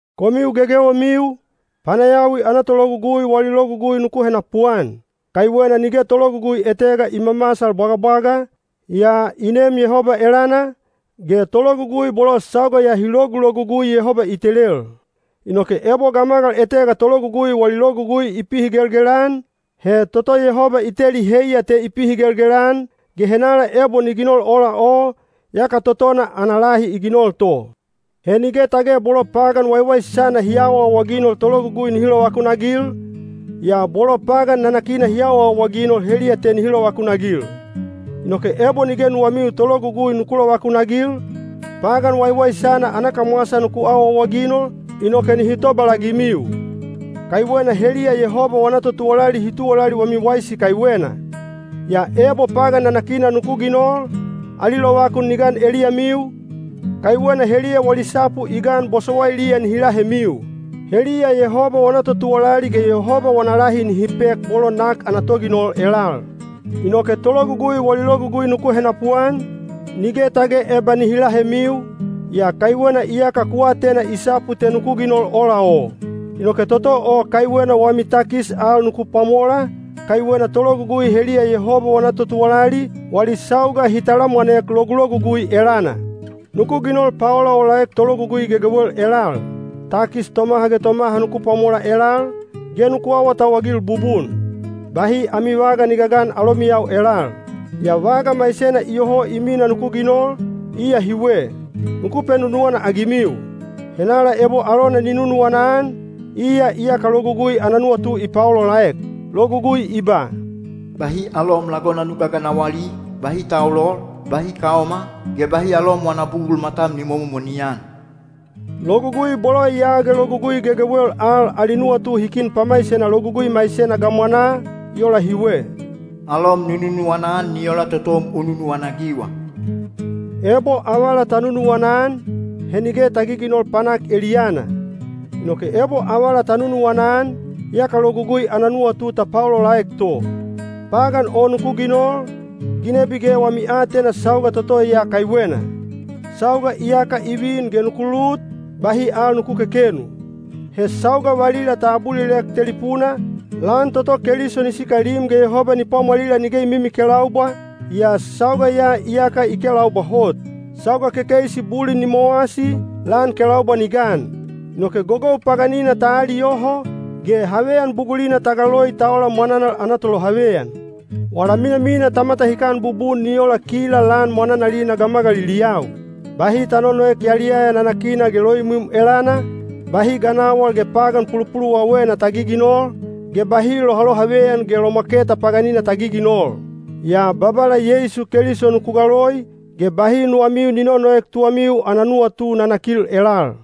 Komiu gegewemiu, panayawi ana tologugui wali logugui nuku henapuan. Kaiwena nige tologugui etega i mamasal bwagabwaga, yaa i neem Yehoba elana, ge tologugui bolo sauga ya hi logulogugui Yehoba i telel. Inoke ebo gamagal etega tologugui wali logugui i pihigelgel-an, he toto Yehoba i teli heiya te i pihigelgel-an, ge henala ebo ni ginol ola o, yaka totona ana lahi i ginol to. He nige tage bolo pagan waiwaisana hi awaawaginol tologugui nihi lovakunagil, yaa bolo pagan nanakina hi awaawaginol heliya te nihi lovakunagil. Inoke ebo nige nuwamiu tologugui nuku lovakunagil, pagan waiwaisana ana kamwasa nuku awaawaginol, inoke nihi tobalagimiu. Kaiwena heliya Yehoba wana totuwalali hi tuwalali wami waisi kaiwena. Yaa ebo pagan nanakina nuku ginol, ali lovakun ni gan eliyamiu, kaiwena heliya wali sapu i gan bosowailiya nihi lahemiu. Heliya Yehoba wana totuwalali ge Yehoba wana lahi nihi pek bolo nak ana toginol elal. Inoke tologugui wali logugui nuku henapuan, nige tage eba nihi lahemiu, yaa kaiwena iyaka ku atena i sapu te nuku ginol ola o. Inoke toto o kaiwena wami takis al nuku pwamola, kaiwena tologugui heliya Yehoba wana totuwalali, wali sauga hi talamwanek logulogugui elana. Nuku ginol paolaolaek tologugui gegewel elal: takis tomaha ge tomaha nuku pwamola elal, ge nuku awatauwagil bubun. Bahi ami vaga ni gagan alomiyau elal. Yaa vaga maisena iyoho i mina nuku ginol, iya hiwe: nuku penunuwana-agimiu. Henala ebo alona ni nunuwana-an, iya iyaka Logugui ana nuwatu i paolaolaek. Logugui i ba, “Bahi alom lagona nu gaganawali,” “bahi taulol,” “bahi kaoma,” ge “bahi alom wana bugul matam ni momomoni-an.” Logugui bolo ya ge logugui gegewel al ali nuwatu hi kin pamaisena logugui maisena gamwanaa, i ola hiwe: “Alom nu nunuwana-an ni ola totom u nunuwana-agiwa.” Ebo avala ta nunuwana-an, he nige ta giginol panak eliyana. Inoke ebo avala ta nunuwana-an, yaka Logugui ana nuwatu ta paolaolaek to. Pagan o nuku ginol, ginebi ge wami aatena sauga toto ya kaiwena. Sauga iyaka i vin ge nuku lut; bahi al nuku kekenu. He sauga valila ta abulilek telipuna, lan toto Keliso ni sikalim ge Yehoba ni pwamwalila nige i mimikelaubwa, yaa sauga ya iyaka i kelaubwa hot. Sauga kekeisi bulin ni mowasi; lan kelaubwa ni gan. Inoke gogou paganina ta aliyoho, ge haveyan bugulina ta galoi ta ola mwananal ana tolohaveyan. Wala minamina ta matahikan bubun ni ola kila lan mwananalina gamagaliliyau. Bahi ta nonoek yaliyaya nanakina ge loimwim elana, bahi ganawal ge pagan pulupuluwawena ta giginol, ge bahi lohalohaveyan ge lomwaketa paganina ta giginol. Yaa Babala Yeisu Keliso nuku galoi, ge bahi nuwamiu ni nonoek tuwamiu ana nuwatu nanakil elal.